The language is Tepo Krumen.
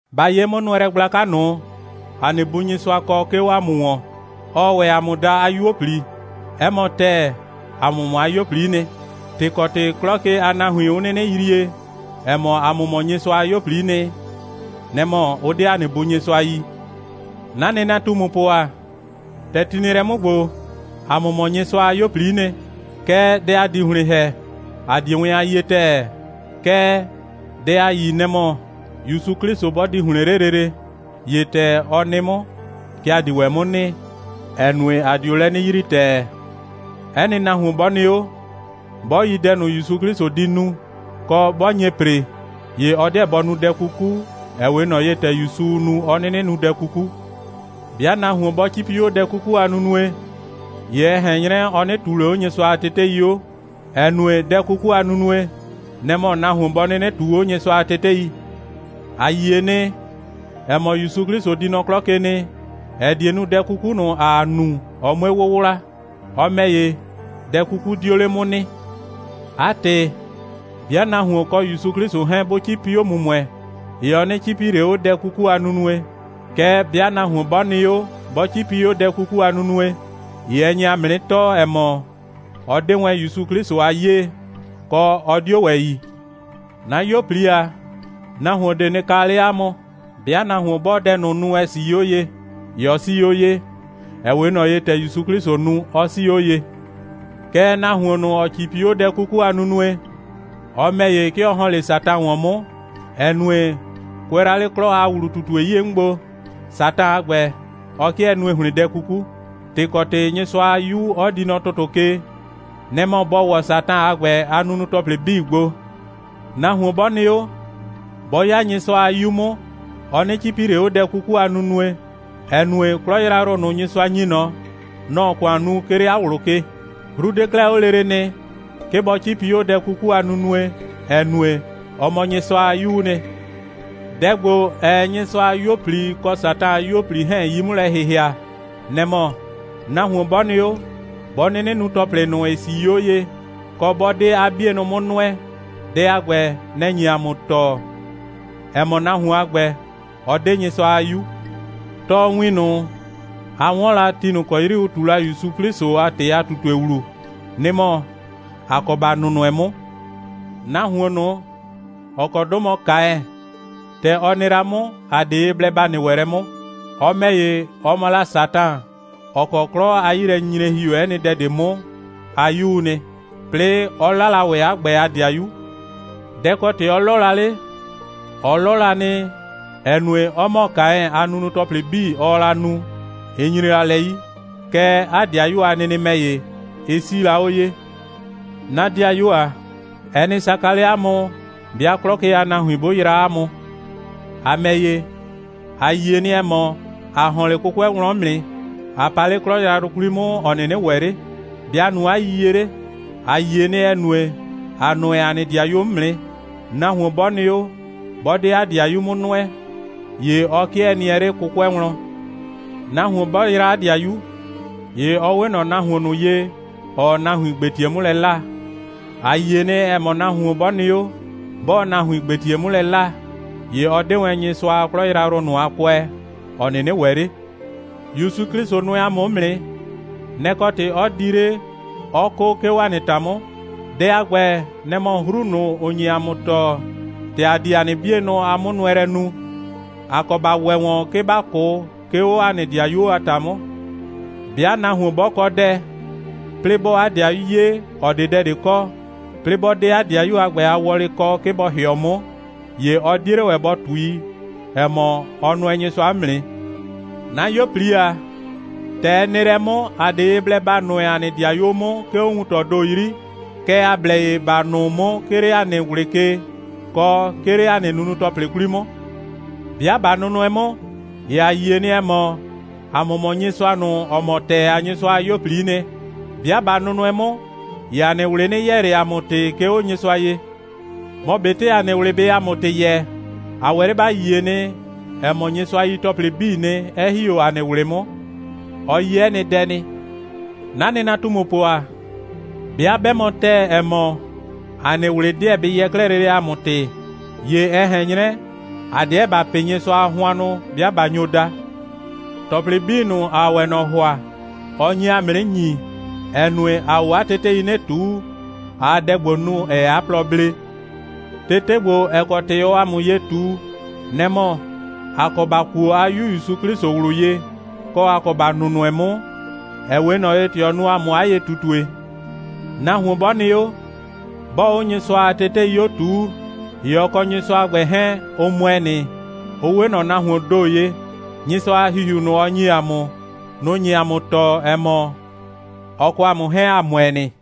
Ba 'ye 'mʋnʋɛlɛ gblaka ꞊nʋ, ‑a nɩ Bu Nyɩsʋa kɔ, 'ke 'o ‑a mʋ ‑wɔn. Ɔɔ ‑wɛ ‑a mʋ daa 'a 'yuo꞊pli. 'Ɛ mɔ ‑tɛɛ, ‑a mʋ mɔ 'a 'yuo꞊pli'i nɩ. ‑Tɩ ‑kɔ ‑tɩ 'klɔ ke a nahuin, 'ʋ 'nɩnɩ yrie, ‑ɛ mɔ, ‑a mʋ mɔ Nyɩsʋa a 'yuo꞊pli'i nɩ, nɛ‑ mɔ, ʋ 'de ‑a nɩ Bu Nyɩsʋa yi. 'Na nɩnatumupʋ ‑a, ‑tɛ ti nɩ lɛ 'mʋ ‑gbo, ‑a mʋ mɔ Nyɩsʋa a 'yuo꞊pli'i nɩ. Kɛɛ, dɛ ‑a di ‑hlɩn ‑hɛ, ‑a 'die wɛn a yie ‑tɛɛ. Kɛɛ, dɛ ‑a yi, nɛ‑ mɔ, ‑Yusu 'Klɩsʋ 'bɔ di ‑hlɩn 'le lele, ‑ye ‑tɛ ɔ nɩ 'mʋ, kɛ ‑a di ‑wɛ 'mʋ nɩ, ‑ɛ nue, ‑a dio lɛ 'nɩ yrii ‑tɛɛ. 'Ɛ nɩ nahuon 'bɔ nɩ 'o, 'bɔ yi dɛ ꞊nʋ, ‑Yusu 'Klɩsʋ di nu, kɔ, 'bɔ nye ‑pre, ‑ye ɔ 'deɛ bɔ nu dɛ 'kuku, ‑ɛ 'we ꞊nɔ ye, ‑tɛ ‑Yusuu nu, 'ɔ 'nɩnɩ nu dɛ 'kuku. 'Bɩa nahuon 'bɔ 'cipi 'o dɛ 'kuku a nunue, ‑ye ɛ ꞊hɛn 'nyrɛ, ɔ 'nɩ ꞊tuu ꞊le 'o Nyɩsʋa a tetei 'o, ‑ɛ nue, dɛ 'kuku a nunue, nɛ‑ mɔ nahuon bɔ 'nɩnɩ ꞊tuu 'o Nyɩsʋa a tetei. A yie nɩ, ‑ɛ mɔ, ‑Yusu 'Klɩsʋ di nɔ 'klɔ ke nɩ, ‑ɛ die nu, dɛ 'kuku ꞊nʋ, ‑aa nu, ɔ 'mue 'wʋwla. Ɔ ‑mɛ ‑ye, dɛ 'kuku 'dio 'le 'mʋ nɩ. 'A ‑tɩ, 'bɩa nahuon kɔ ‑Yusu 'Klɩsʋ 'hɛɛn, 'bʋ 'cipi 'o ‑mʋmʋɛ, ‑ye ɔ 'nɩ 'cipi ꞊le 'o dɛ 'kuku a nunue. Kɛɛ, 'bɩa nahuon 'bɔ nɩ 'o, 'bɔ 'cipi 'o dɛ 'kuku a nunue, ‑ye ɛ nye ‑a mʋ 'nɩ tɔɔ, ‑ɛ mɔ, ɔ 'de wɛn ‑Yusu 'Klɩsʋ a 'yee, kɔ, ɔ 'dio ‑wɛ yi. 'Na 'yuo꞊pli ‑a, nahuon ꞊de nɩ kaa 'le 'a mʋ. 'Bɩa nahuon 'bɔɔ dɛ ꞊nʋ nu, ‑ɛ 'sii 'o ye, ‑ye ɔ 'sii 'o ye, ‑ɛ 'we ꞊nɔ ye, ‑tɛ ‑Yusu 'Klɩsʋ nu, 'ɔ 'sii 'o ye. Kɛɛ, nahuon ꞊nʋ, ‑ɔ 'cipi 'o dɛ 'kuku a nunue, ɔ ‑mɛ ‑ye, 'ke ɔ ‑hɔn 'le Satan ‑wɔn 'mʋ, ‑ɛ nue, kʋɛ la 'le 'klɔ a ‑wlu꞊tutue 'yie 'mʋ gbo, Satan a ‑gbɛ, ɔ 'kɩɛ nue ‑hlɩn dɛ 'kuku. ‑Tɩ ‑kɔ ‑tɩ Nyɩsʋa a 'Yu 'ɔ di nɔ ‑tʋtʋ ke, nɛ‑ mɔ bɔ ‑wɔ Satan a ‑gbɛ a nunu‑tɔplɩ 'bii gbo. Nahuon 'bɔ nɩ 'o, 'bɔ 'ya Nyɩsʋa a 'yu 'mʋ, ɔ 'nɩ 'cipi ꞊le 'o dɛ 'kuku a nunue, ‑ɛ nue, 'klɔ yrayrʋ ꞊nʋ, Nyɩsʋa ‑nyi ꞊nɔ, nɔ‑ɔ ‑kʋan nu, 'ke 'le 'a ꞊wlʋ ke. 'Hru 'de 'klɛɛ 'o lele nɩ, 'ke bɔ 'cipi 'o dɛ 'kuku a nunue, ‑ɛ nue, ɔ mɔ Nyɩsʋa a 'yuu nɩ. Dɛ ‑gbo, ‑ɛɛ Nyɩsʋa a 'yuo꞊pli kɔ Satan a 'yuo꞊pli 'hɛɛn 'yi 'mʋ lɛ ‑hɩhɩa, nɛ‑ mɔ: Nahuon 'bɔ nɩ 'o, 'bɔ 'nɩnɩ nu ‑tɔplɩ ꞊nʋ, ‑ɩ 'sii 'o ye, kɔ, 'bɔ 'de 'a 'bienʋ 'mʋ nʋɛ, dɛ a ‑gbɛ, nɛ‑ nye ‑a mʋ tɔɔ, ‑ɛ mɔ, nahuon a ‑gbɛ, ɔ 'de Nyɩsʋa a 'yu. Tɔɔwin ꞊nʋ, a 'wɔn la ti ꞊nʋ ‑kɔ 'yri ʋ ꞊tu la ‑Yusu 'Klɩsʋ a ‑tɩ a ꞊tutue ‑wlu, nɩ‑ mɔ: ‑A kɔ ‑ba nʋnʋɛ 'mʋ. Nahuon ꞊nʋ, ‑ɔ kɔ 'dʋ mɔ Kaɛn, ‑tɛ ɔ nɩ la 'mʋ, ‑a 'de ye blɛ ‑ba nɩ ‑wɛ lɛ 'mʋ. Ɔ ‑mɛ ‑ye, ɔ mɔ la Satan, ‑ɔ kɔ 'klɔ a 'yilɛnyinyre ‑hi ‑o 'ɛ nɩ dɛ ꞊de 'mʋ a 'yuu nɩ, 'plɩɩ 'ɔ 'la la ‑wɛ 'a ‑gbɛ a ‑dɩayu. Dɛ‑ kɔ ‑tɩ 'ɔ 'lɔ la 'le? Ɔ 'lɔ la nɩ, ‑ɛ nue, 'ɔ ‑mɔ Kaɛn, 'a nunu‑tɔplɩ 'bii, ɔɔ la nu, ɩ nyre la lɛ 'yi. Kɛɛ, 'a ‑dɩayu a nɩnɩ ‑mɛ ‑ye, ɩ 'sii la 'o ye. 'Na 'dɩayuo ‑a, ɛ nɩ saka 'le 'a mʋ, 'bɩa 'klɔ ke a nahuin 'bʋ yraa 'a mʋ. ‑A ‑mɛ ‑ye, ‑a yie nɩ, ‑ɛ mɔ, ‑a ‑hɔn 'le 'kʋkʋɛ wlɔn 'mʋ nɩ, ꞊a pa 'le 'klɔ yrayrʋ 'kwli 'mʋ, ‑ɔ 'nɩnɩ ‑wɛ 'le. ‑Be' ‑a nu 'a yiyie 'le? ‑A yie nɩ, ‑ɛ nue, ‑a nʋɛ ‑a nɩ ‑dɩayuo 'mʋ nɩ. Nahuon 'bɔ nɩ 'o, 'bɔ 'de 'a ‑dɩayuo 'mʋ nʋɛ, ‑ye 'ke ɔ 'kɩɛ nɩɛ 'le 'kʋkʋɛ wlɔn. Nahuon 'bɔ yraa 'a ‑dɩayu, ‑ye ɔ 'we ꞊nɔ nahuon ꞊nʋ ye, ‑ɔɔ nahuin ‑gbetie 'mʋ lɛ 'laa. A yie nɩ, ‑ɛ mɔ, nahuon 'bɔ nɩ 'o, 'bɔɔ nahuin ‑gbetie 'mʋ lɛ 'laa, ‑ye ɔ 'de wɛn Nyɩsʋa a 'klɔ yrayrʋ ꞊nʋ a kʋɛ, ‑ɔ 'nɩnɩ ‑wɛ 'le. ‑Yusu 'Klɩsʋ nʋɛ ‑a mʋ 'mʋ nɩ. Nɛ‑ kɔ ‑tɩ 'ɔ di 'le, 'ɔ 'kʋ, 'ke 'o ‑a nɩ ‑ta 'mʋ. Dɛ a ‑gbɛ, nɛ‑ mɔ 'hru ꞊nʋ, ‑ʋ nye ‑a mʋ tɔɔ, ‑tɛ ‑a di ‑a nɩ 'bienʋ a 'mʋnʋɛlɛ nu. ‑A kɔ ‑ba ‑wɛ ‑wɛ ‑wɔn, 'ke ‑ba 'kʋ, 'ke 'o ‑a nɩ ‑dɩayuo a ‑ta 'mʋ. 'Bɩa nahuon 'bɔ kɔ dɛ, 'plɩɩ 'bɔɔ 'a 'dɩayu 'ye, ‑ɔ 'de dɛ ꞊de kɔ, 'plɩɩ 'bɔ 'de 'a 'dɩayu a ‑gbɛ a wɔlɩ kɔ, 'ke bɔ ‑hɩɔ 'mʋ, ‑ye ɔ 'die 'le ‑wɛ bɔ ꞊tui, ‑ɛ mɔ, ɔ nʋɛ Nyɩsʋa 'mʋ nɩ. 'Na 'yuo꞊pli ‑a, ‑tɛ ɛ nɩ lɛ 'mʋ, ‑a 'de ye blɛ ‑ba nʋɛ ‑a nɩ ‑dɩayuo 'mʋ, 'ke 'o wuntɔɔ ‑do 'yri, kɛɛ, ‑a blɛ ye ‑ba nʋʋ 'mʋ, 'ke 'le ‑a nɩ ꞊wlɩ ke, kɔ, 'ke 'le ‑a nɩ nunu‑tɔplɩ 'kwli 'mʋ. 'Bɩa ꞊ba nʋnʋɛ 'mʋ, ‑ye ‑a yie nɩ, ‑ɛ mɔ, ‑a mʋ mɔ Nyɩsʋa ꞊nʋ, ‑ɔ mɔ ‑tɛɛ a Nyɩsʋa a 'yuo꞊pli'i nɩ. 'Bɩa ꞊ba nʋnʋɛ 'mʋ, ‑ye ‑a nɩ ꞊wlɩ 'nɩ yɛɛ ꞊le ‑a mʋ ‑tɩ, 'ke 'o Nyɩsʋa ye. Mɔ ꞊betɩ ‑a nɩ ꞊wlɩ bɩɩ ‑a mʋ ‑tɩ yɛɛ, ‑a ‑wɛ 'le ‑ba yie nɩ, ‑ɛ mɔ, Nyɩsʋa yi ‑tɔplɩ 'bii nɩ, 'ɛ ‑hi 'o ‑a nɩ ꞊wlɩ 'mʋ. Ɔ yi 'ɛ nɩ dɛ nɩ. 'Na nɩnatumupʋ ‑a, 'bɩa 'bɛ mɔ ‑tɛɛ, ‑ɛ mɔ, ‑a nɩ ꞊wlɩ 'deɛ bɩ yɛɛ 'klɛɛ lele ‑a mʋ ‑tɩ, ‑ye ɛ ꞊hɛn 'nyrɛ, ‑a 'deɛ ‑ba pɩ Nyɩsʋa a hʋannʋ, 'bɩa ꞊ba nyo da. ‑Tɔplɩ 'bii ꞊nʋ, ‑aa ‑wɛ ꞊nɔ ‑hʋa, ɔ nyi ‑a mʋ 'nɩ ‑nyi, ‑ɛ nue, ‑aa 'o 'a tetei 'nɩ ꞊tuu, ꞊aa dɛ ‑gbo nu, ‑ɛɛ 'a plɔ blee. Tete ‑gbo, ‑ɛ kɔ ‑tɩ ɔɔ ‑a mʋ ye ꞊tu, nɛ‑ mɔ: ‑A kɔ ‑ba kuo 'a 'Yu ‑Yusu 'Klɩsʋ ꞊wlʋ ye, kɔ, ‑a kɔ ‑ba nʋnʋɛ 'mʋ, ‑ɛ 'we ꞊nɔ ye, ‑tɛ ɔ nu ‑a mʋ 'a ye꞊tutue. Nahuon 'bɔ nɩ 'o, 'bɔɔ 'o Nyɩsʋa a tetei 'o ꞊tuu, ‑ye ɔ kɔ Nyɩsʋa a ‑gbɛ 'hɛɛn, ʋ ‑mʋɛ nɩ, ʋ 'we ꞊nɔ nahuoon ‑do ye. Nyɩsʋa a ‑Hihiu ꞊nʋ, ɔ ‑nyi ‑a mʋ, nʋ‑ nye ‑a mʋ tɔɔ, ‑ɛ mɔ, ɔ kɔ ‑a mʋ 'hɛɛn, ‑a ‑mʋɛ nɩ.